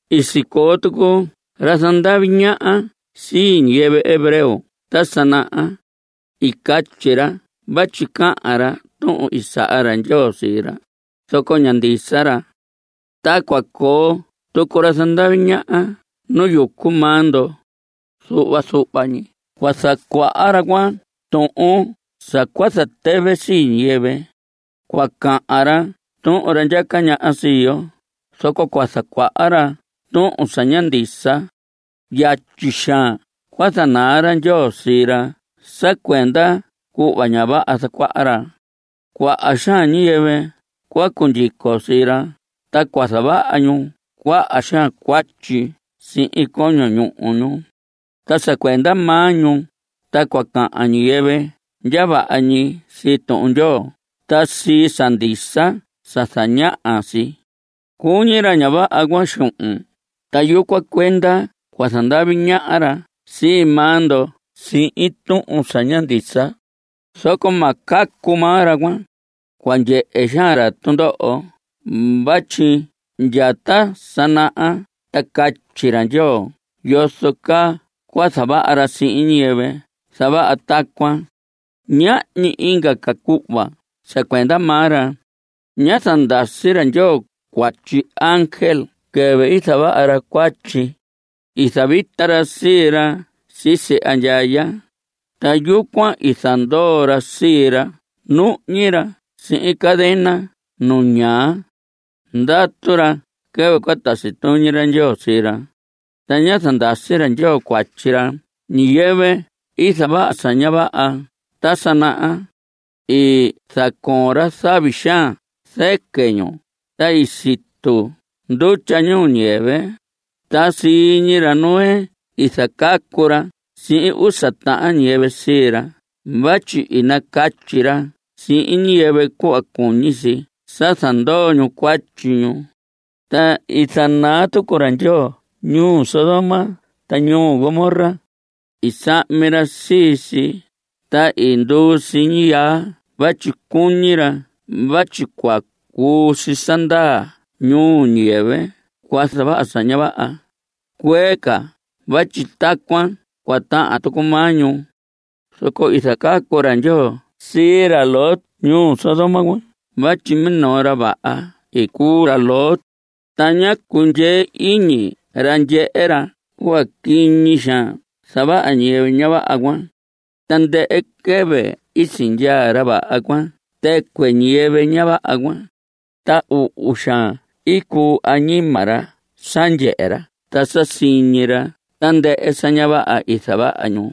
I sicoo tucu ra zandavi ñaha sii ñiyɨvɨ hebreo ta sa naha. I catyi ra vatyi cahan ra tuhun i saha ra Ndyoo sii ra, zoco ña ndisa ra. Ta cua coo tucu ra zandavi ñaha nu yucu maa ndo. Zuhva zuhva ñi cua zacuaha ra tuhun sa cua zatɨvɨ sii ñiyɨvɨ. Cua cahan ra tuhun ra ndyaca ñaha sii yo, zoco cua zacuaha ra tuhun sa ña ndisa. Yatyi xaan cua zanaa ra Ndyoo sii ra sa cuenda cuhva ña vaha zacuaha ra. Cuaha xaan ñiyɨvɨ cua cundyico sii ra, ta cua zavaha ñu cuaha xaan cuatyi sihin coño ñuhu ñu. Ta sa cuenda maa ñu, ta cua cahan ñiyɨvɨ ndya vaha ñi sii Tuhun Ndyoo ta sii sa ndisa sa zañaha si. Cuñi ra ña vaha cuan xuhun, ta yucuan cuenda cua zandavi ñaha ra sii maa ndo sihin tuhun sa ña ndisa. Zoco ma cacu maa ra cuan. Cua ndyehe xaan ra tundoho vatyi ndya ta sa naha sa catyi ra Ndyoo yozo caa cua zavaha ra sihin ñiyɨvɨ zavaha tacuan. Ñahñi inga ca cuhva sa cuenda maa ra. Ná zandasi ra Ndyoo cuatyi ángel quɨvɨ i zavaha ra cuatyi. I zavita ra sii ra sisi andyaya, ta yucuan i zandoo ra sii ra nuhñi ra sihin cadena nu ñaa. Ndatu ra quɨvɨ cua tasi tuñi ra Ndyoo sii ra. Ta ñá zandasi ra Ndyoo cuatyi ñiyɨvɨ i zavaha sa ña vaha ta sa naha. I zacoon ra zavi xaan zɨquɨ ñu, ta i situ ndutya ñuu ñiyɨvɨ, ta sii ñi ra Noé i zacacu ra sihin usa tahan ñiyɨvɨ sii ra vatyi i nacatyi ra sihin ñiyɨvɨ cuhva cuñi si sa zandoo ñu cuatyi ñu. Ta i zanaa tucu ra Ndyoo ñuu Sodoma ta ñuu Gomorra. I sahmi ra sii si, ta i nduu si ñiyaa vatyi cuñi ra vatyi cua cuu si sa ndaa nuu ñiyɨvɨ cua zavaha sa ña vaha cuee ca vatyi tacuan cua tahan tucu maa ñu. Zoco i zacacu ra Ndyoo sii ra Lot ñuu Sodoma cuan vatyi minoo ra vaha i cuu ra Lot, ta ñá cundyee iñi ra ndyehe ra cuhva quiñi xaan zavaha ñiyɨvɨ ña vaha cuan. Tandɨhɨ quɨvɨ i sindyaa ra vaha cuan tɨcuɨ ñiyɨvɨ ña vaha cuan, ta uhu xaan cuu añima ra sa ndyehe ra ta sa siñi ra tandɨhɨ sa ña vaha i zavaha ñu.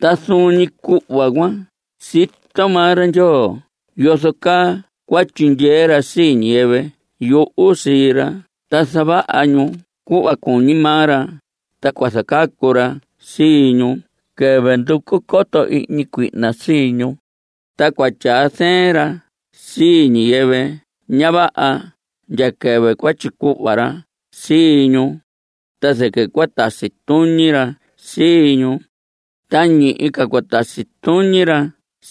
Ta zuun ñi cuhva cuan, sito maa ra Ndyoo yozo caa cua tyindyee ra sii ñiyɨvɨ yuhu sii ra ta zavaha ñu cuhva cuñi maa ra, ta cua zacacu ra sii ñu quɨvɨ nducu coto ihñi cuihna sii ñu. Ta cua tyaa zɨɨn ra sii ñiyɨvɨ ña vaha ndya quɨvɨ cua tyicuhva ra sii ñu, ta zɨquɨ cua tasi tuñi ra sii ñu. Ta ñihi ca cua tasi tuñi ra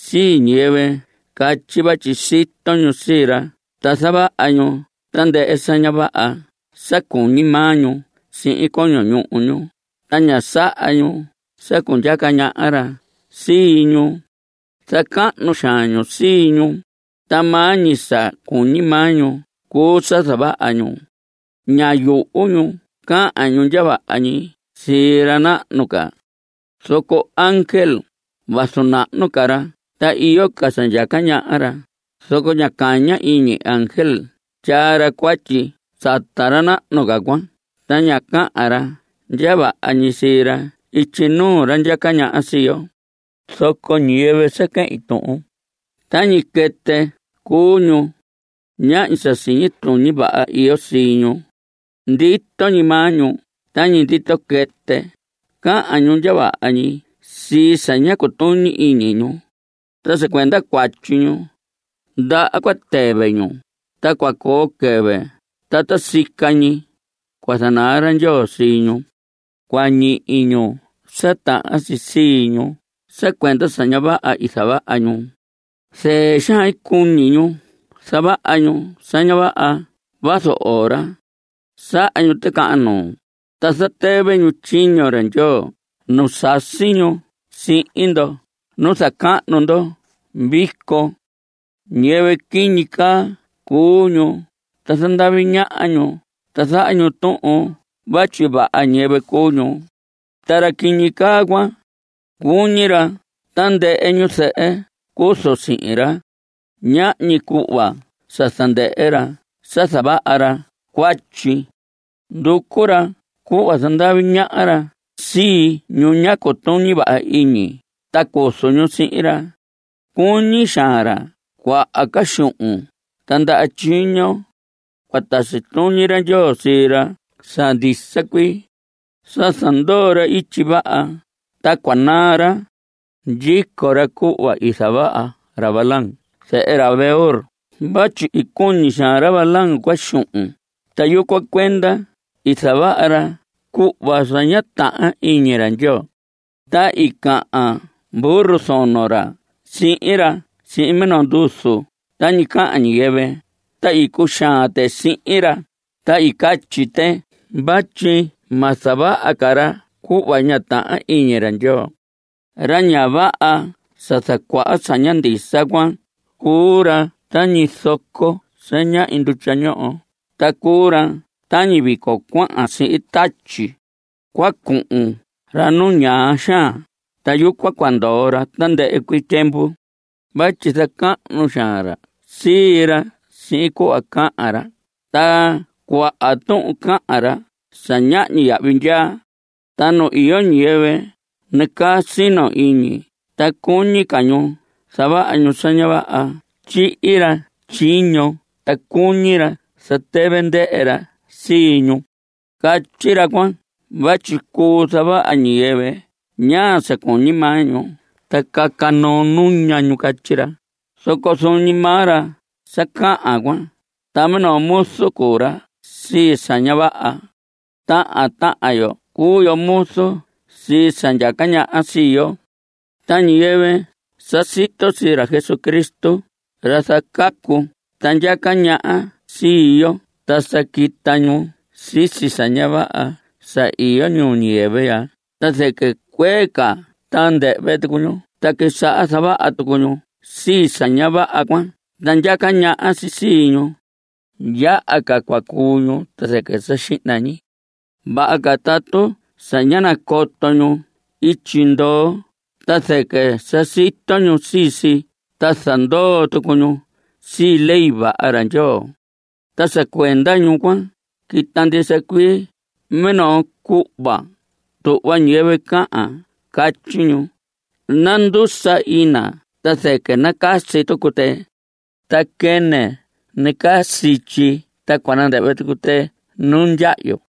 sii ñiyɨvɨ catyi vatyi sito ñu sii ra ta zavaha ñu tandɨhɨ sa ña vaha sa cuñi maa ñu sihin coño ñuhu ñu, ta ña saha ñu sa cundyaca ñaha ra sii ñu. Zacahnu xaan ñu sii ñu, ta maa ñi sa cuñi maa ñu cuu sa zavaha ñu. Ña yuhu ñu cahan ñu ndya vaha ñi sii ra nahnu ca. Zoco ángel, vazu nahnu ca ra ta iyo ca sa ndyaca ñaha ra, zoco ña caña iñi ángel tyaa ra cuatyi sata ra nahnu ca cuan ta ña cahan ra ndya vaha ñi sii ra ityi nuu ra ndyaca ñaha sii yo. Zoco ñiyɨvɨ sa quehin tuhun, tañi quɨtɨ cuu ñu. Ñahñi sa siñi tuñi vaha iyo sii ñu. Ndito ñi maa ñu tañi ndito quɨtɨ. Cahan ñu ndya vaha ñi sii sa ña cutuñi iñi ñu. Ta sa cuenda cuatyi ñu, ndaha cua tɨvɨ ñu, ta cua coo quɨvɨ ta ta sica ñi cua zanaa ra Ndyoo sii ñu. Cua ñihi ñu sa tahan si sii ñu sa cuenda sa ña vaha i zavaha ñu. Zɨɨ xaan cuñi ñu zavaha ñu sa ña vaha vazu ora. Saha ñu ticahan nuu, ta zatɨvɨ ñu tyiño ra Ndyoo nu sasi ñu sihin ndo nu zacahnu ndo vico. Ñiyɨvɨ quiñi caa cuu ñu, ta zandavi ñaha ñu ta zaha ñu tuhun vatyi ñiyɨvɨ vaha cuu ñu. Ta ra quiñi caa cuan, cuñi ra sa tandɨhɨ ñu zɨhɨ cuzu sihin ra. Ñahñi cuhva sa zandɨhɨ ra sa zavaha ra cuatyi. Nducu ra cuhva zandavi ñaha ra sii ñu ña cutuñi vaha iñi ta cuzu ñu sihin ra. Cuñi xaan ra cuaha ca xuhun ta ndaha tyiño. Cua tasi tuñi ra Ndyoo sii ra sa ndisa cuii. Sa zandoo ra ityi vaha, ta cua naa ra. Ndyico ra cuhva i zavaha ra Balaam zehe ra Beor vatyi i cuñi xaan ra Balaam cuan xuhun, ta yucuan cuenda i zavaha ra cuhva sa ña tahan iñi ra Ndyoo. Ta i cahan burro zono ra sihin ra sihin minoo nduzu tañi cahan ñiyɨvɨ, ta i cuxaan tɨ sihin ra, ta i catyi tɨ vatyi ma zavaha ca ra cuhva ña tahan iñi ra Ndyoo. Ra ña vaha sa zacuaha sa ña ndisa cuan, cuu ra tañi zoco sa ñahñi ndutya ñoho, ta cuu ra tañi vico cuahan sihin tatyi. Cua cuhun ra nu ñaa xaan, ta yucuan cua ndoo ra tandɨhɨ cuii tyiemvu. Vatyi zacahnu xaan ra sii ra sihin cuhva cahan ra, ta cuaha tuhun cahan ra sa ñahñi yahvi ndyaa. Ta nu iyo ñiyɨvɨ nacaa sino iñi ta cuñi ca ñu zavaha ñu sa ña vaha, tyihi ra tyiño ta cuñi ra zatɨvɨ ndɨhɨ ra sii ñu. Catyi ra cuan vatyi cuu zavaha ñiyɨvɨ ñaa sa cuñi maa ñu, ta caca noo nuña ñu catyi ra, zoco zuun ñi maa ra sa cahan cuan, ta minoo muzu cuu ra sii sa ña vaha. Tahan tahan yo cuu yo muzu sii sa ndyaca ñaha sii yo. Ta ñiyɨvɨ sa sito sii ra Jesucristo, ra zacacu ta ndyaca ñaha sii yo, ta sa quita ñu sisi sa ña vaha sa iyo ñuu ñiyɨvɨ ya, ta zɨquɨ cuee ca ta nandɨhvɨ tucu ñu ta quisaha zavaha tucu ñu sii sa ña vaha cuan ta ndyaca ñaha si sii ñu. Yaha ca cua cuu ñu ta zɨquɨ sa xihna ñi. Vaha ca tatu sa ñá nacoto ñu ityi ndoo ta zɨquɨ sa sito ñu sii si ta zandoo tucu ñu sii ley vaha ra Ndyoo. Ta sa cuenda ñu cuan, quita ndisa cuii minoo cuhva tuhva ñiyɨvɨ cahan. Catyi ñu: “Nandusa ina ta zɨquɨ nacasi tucu tɨ. Ta quɨnɨ nacaa sityi ta cua nandɨhvɨ tucu tɨ nu ndyahyu.”